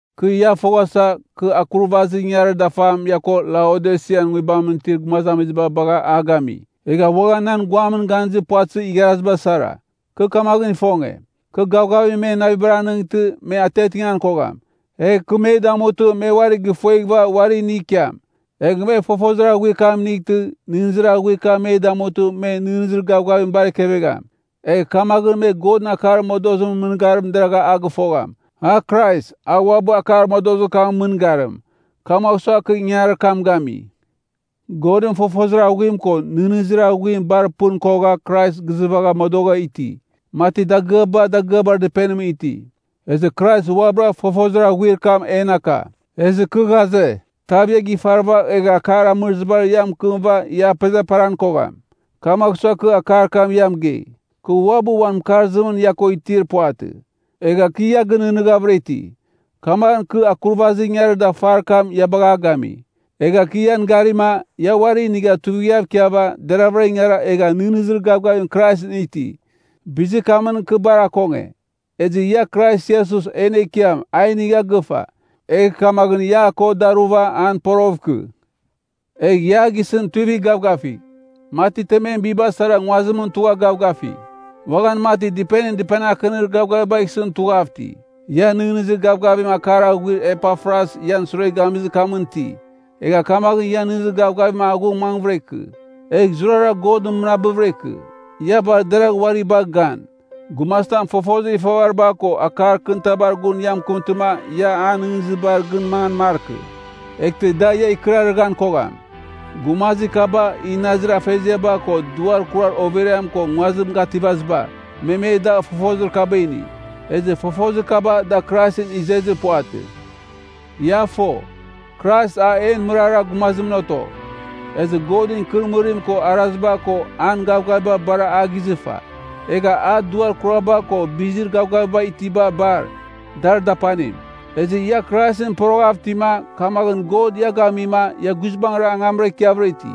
Kɨ ia foghasa, kɨ akurvazir ingangarir dafam ia ko Laodisian nguibamɨn itir gumazamiziba bagha a gami, egha uaghan nan guamɨn ganizir puvatɨzir igharaziba sara. Kɨ kamaghɨn ifonge, kɨ gavgavim men navibar anɨngtɨ me atiatingan kogham, egh kɨ me damutɨ me uari gifueghɨva uari inigh ikiam, egh me fofozir aghuim inightɨ nɨghnɨzir aghuir kam me damutɨ men nɨghnɨzir gavgavim bar ekevegham. Egh kamaghɨn me Godɨn akar modozimɨn mɨngarim deraghvɨra a gɨfogham, a Krais, a uabɨ akar modozir kamɨn mɨngarim. Kamagh sua kɨ ingangarir kam gami. Godɨn fofozir aghuim ko nɨghnɨzir aghuim bar pɨn kogha Krais gizɨvagha modogha iti, mati dagɨaba dagɨabar dɨpenimɨn iti. Ezɨ Krais uabɨra fofozir aghuir kam en aka. Ezɨ kɨ ghaze, tav ia gifarɨva egh akar amɨrɨzibar ia mɨkɨmɨva ia apezaperan kogham. Kamagh sua, kɨ akar kam ia mɨgei. Kɨ uabɨ uan mɨkarzimɨn ia ko itir puvatɨ, egha kɨ ia gɨnɨghnɨghavɨra iti. Kamaghɨn kɨ akurvazir ingangarir dafar kam ia bagha a gami. Egha kɨ ian garima, ia uari inigha tuivighav ikiava deragha ingara egha nɨghnɨzir gavgavim Kraisɨn iti. Bizir kamɨn kɨ bar akonge. Ezɨ ia Krais Iesus en Ekiam ia a inigha gɨfa, egh kamaghɨn ia a ko daruva an poroghɨv ikɨ. Egh ia a gisɨn tuivigh gavgavigh, mati temem biba sara nguazimɨn tugha gavgafi. Uaghan mati dɨpenim dɨpenir akɨnir gavgavibagh isɨn tughav iti. Ia nɨghnɨzir gavgavim akar aghuir Epafras ian sure gamizir kamɨn iti, egh kamaghɨn ian nɨghnɨzir gavgavim aghung mangvɨra ikɨ. Egh zurara God mɨnabɨvɨra ikɨ. Ia bar deragh uari bagh gan, gumazitam fofozir ifavariba ko akar kɨnitabar gun ia mɨkɨmtɨma ia an nɨghnɨzibar gɨn mangan markɨ, eghtɨ da ia ikɨrarɨghan kogham. Gumazir kaba, inazir afeziaba ko duar kurar overiam ko nguazim gativaziba, me me da fofozir kaba ini. Ezɨ fofozir kaba da Kraisɨn izezir puvatɨ. Ia fo, Krais a en mɨrara gumazimɨn oto, ezɨ Godɨn ikɨrɨmɨrim ko araziba ko an gavgaviba bar a gizɨfa. Egha a duar gavgaviba ko bizir gavgaviba itiba bar, dar dapanim. Ezɨ ia Kraisɨn poroghav itima, kamaghɨn God ia gamima ia guizbangɨra angamra ikiavɨra iti.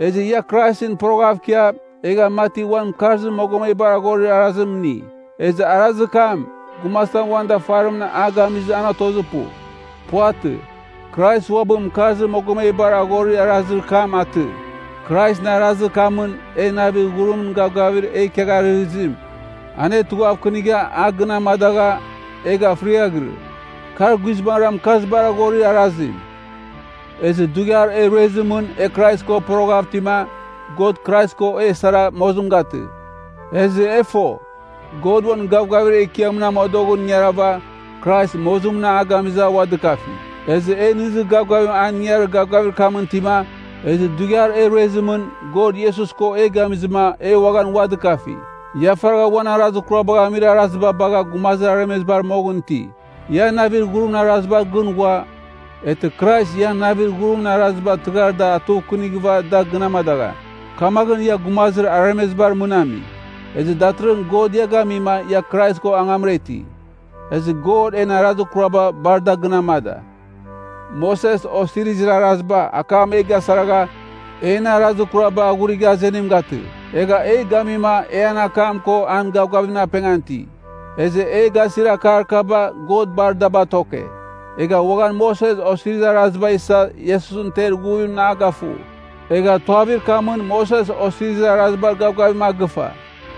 Ezɨ ia Kraisɨn poroghav ikia, egha mati uan mɨkarzir mogomebar ghorir arazim ini. Ezɨ arazir kam, gumazitam uan dafarimɨn a gamizɨma an otozir pu. Puvatɨ. Krais uabɨ mɨkarzir mogomebar aghorir arazir kam atɨ. Kraisɨn arazir kamɨn e, navir ghurimɨn gavgavir e ikiagharɨghɨzim, anetughavkɨnigha a gɨn amadagha, egha fɨriaghɨrɨ. Kar guizbangɨra mɨkarzibar aghorir arazim. Ezɨ dughiar e ruezimɨn e Krais ko poroghav itima, God Krais ko e sara mozim gatɨ. Ezɨ e fo, God uan gavgavir ekiamɨn amodoghɨn ingarava Krais mozimɨn a gamizɨ a ua dɨkafi. Ezɨ e nɨghnɨzir gavgavim an ingangarir gavgavir kamɨn itima, ezɨ dughiar e ruezimɨn, God Iesus ko e gamizɨma e uaghan ua dɨkafi. Ia faragha uan arazir kurabagh amir arazim bagha gumazir aremezibar moghɨn iti. Ia navir ghurimɨn arazibar gɨn ghua, eghtɨ Krais ian navir ghurimɨn araziba tɨghar da atughuvkɨnighɨva da gɨn amadagham, kamaghɨn ia gumazir aremezibar mɨn ami. Ezɨ datɨrɨghɨn God ia gamima ia Krais ko angamra iti. Ezɨ God en arazir kuraba bar a da gɨn amada. Moses Osirizir Araziba, akam e gasaragha, en arazir kuraba aghurigha azenim gatɨ, egha e gamima e an akam ko an gavgavimɨn apengan iti. Ezɨ e gasir akar kaba God bar da batoke, egha uaghan Moses Osirizir Araziba isa Iesusɨn ter ighuvimɨn a gafu, egha tuavir kamɨn Moses Osirizir Arazibar gavgavim a gɨfa.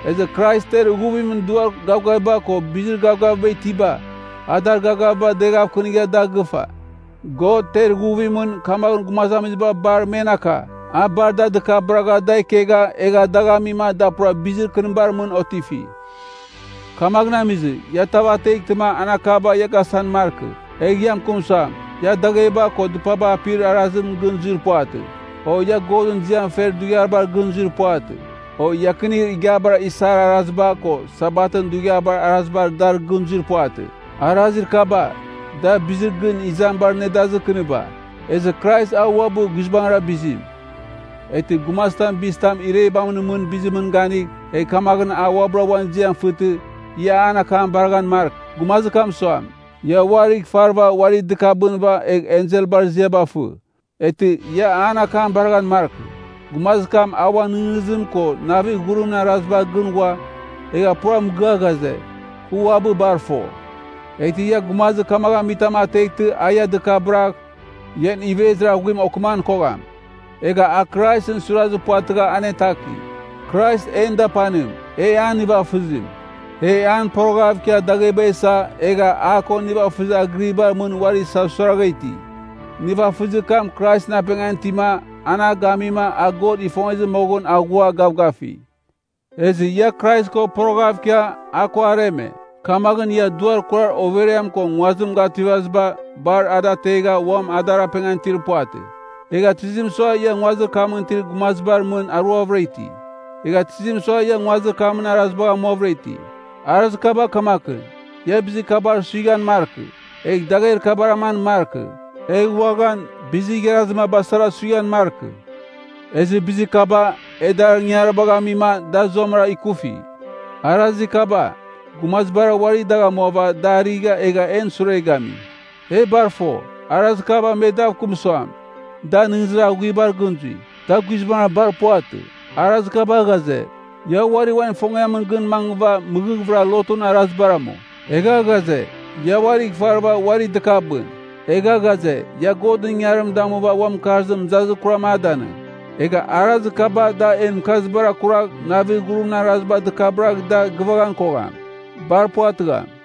Ezɨ Krais ter ighuvimɨn duar gavgaviba ko bizir gavgaviba itiba, a dar gavgaviba deghavkɨnigha da gɨfa. God ter ighuvimɨn, kamaghɨn gumazamiziba bar men aka, a bar da dɨkabɨragha da ikegha dagh amima da pura bizir kɨnibar mɨn otifi. Kamaghɨn amizɨ, ia tav ateghtɨma an akaba ia gasan markɨ, egh ia mɨkɨm suam, ia dagheba ko dɨpaba apir arazibar gɨn zuir puvatɨ, o ia Godɨn ziam fer dughiabar gɨn zuir puvatɨ, o iakinir igiabar isar araziba ko Sabatɨn dughiabar arazibar dar gɨn zuir puvatɨ. Arazir kaba, da bizir gɨn izamibar nedazir kɨniba, ezɨ Krais a uabɨ guizbangɨn bizim. Eghtɨ gumazitam bizitam irebamɨn mɨn bizimɨn ganigh, egh kamaghɨn a uabɨra uan ziam fɨtɨ, ia an akam baraghan markɨ. Gumazir kam suam, ia uarigh ifarɨva uari dɨkabɨnɨva egh enselbar ziaba fɨ. Eghtɨ ia an akam baraghan markɨ. Gumazir kam a uan nɨghnɨzim ko navir ghurimɨn arazibar gɨn ghua, egha pura mɨgɨa ghaze, kɨ uabɨ bar fo. Eghtɨ ia gumazir kamagh amitam ateghtɨ a ia dɨkabɨragh, ian ivezir aghuim okɨman kogham. Egha a Kraisɨn suirazir puvatɨgha anetaki, Krais en dapanim, e an nivafɨzim. E an poroghav ikia dagheba isa egha a ko nivafɨzir agɨribar mɨn uari isasuiragha iti. Nivafɨzir kam Kraisɨn apengan itima an a gamima a God ifongezɨ moghɨn aghua gavgafi. Ezɨ ia Krais ko poroghav ikia a ko areme, kamaghɨn ia duar kurar overiam ko nguazim gativaziba bar ada ategha uam adar apengan itir puvatɨ. Egha tizim sua ia nguazir kamɨn itir gumazibar mɨn aruavɨra iti? Egha tizim sua ia nguazir kamɨn arazibagh amuavɨra iti? Arazir kaba kamakɨn, “Ia bizir kabar suighan markɨ,” egh “Dagher kabar aman markɨ,” egh uaghan “Bizir igharazir maba sara suighan markɨ.” Ezɨ bizir kaba, e dar ingangaribagh amima da zuamɨra ikufi. Arazir kaba, gumazibara uari dagh amuava da arɨgha egha en sure gami. E bar fo, arazir kaba me dav kɨm suam, da nɨghnɨzir aghuibar gɨn zui. Da guizbangɨra bar puvatɨ. Arazir kaba ghaze, ia uari uan ifongiamɨn gɨn mangɨva mɨghɨghvɨra lotun arazibar amu. Egha ghaze, ia uarigh ifarɨva uari dɨkabɨn. Egha ghaze, ia Godɨn ingangarim damuva uan mɨkarzim mɨzazir kuram a danɨng. Egha arazir kaba da en mɨkarzibar akuragh navir ghurimɨn araziba dɨkabɨragh da gɨvaghan kogham. Bar puvatɨgham.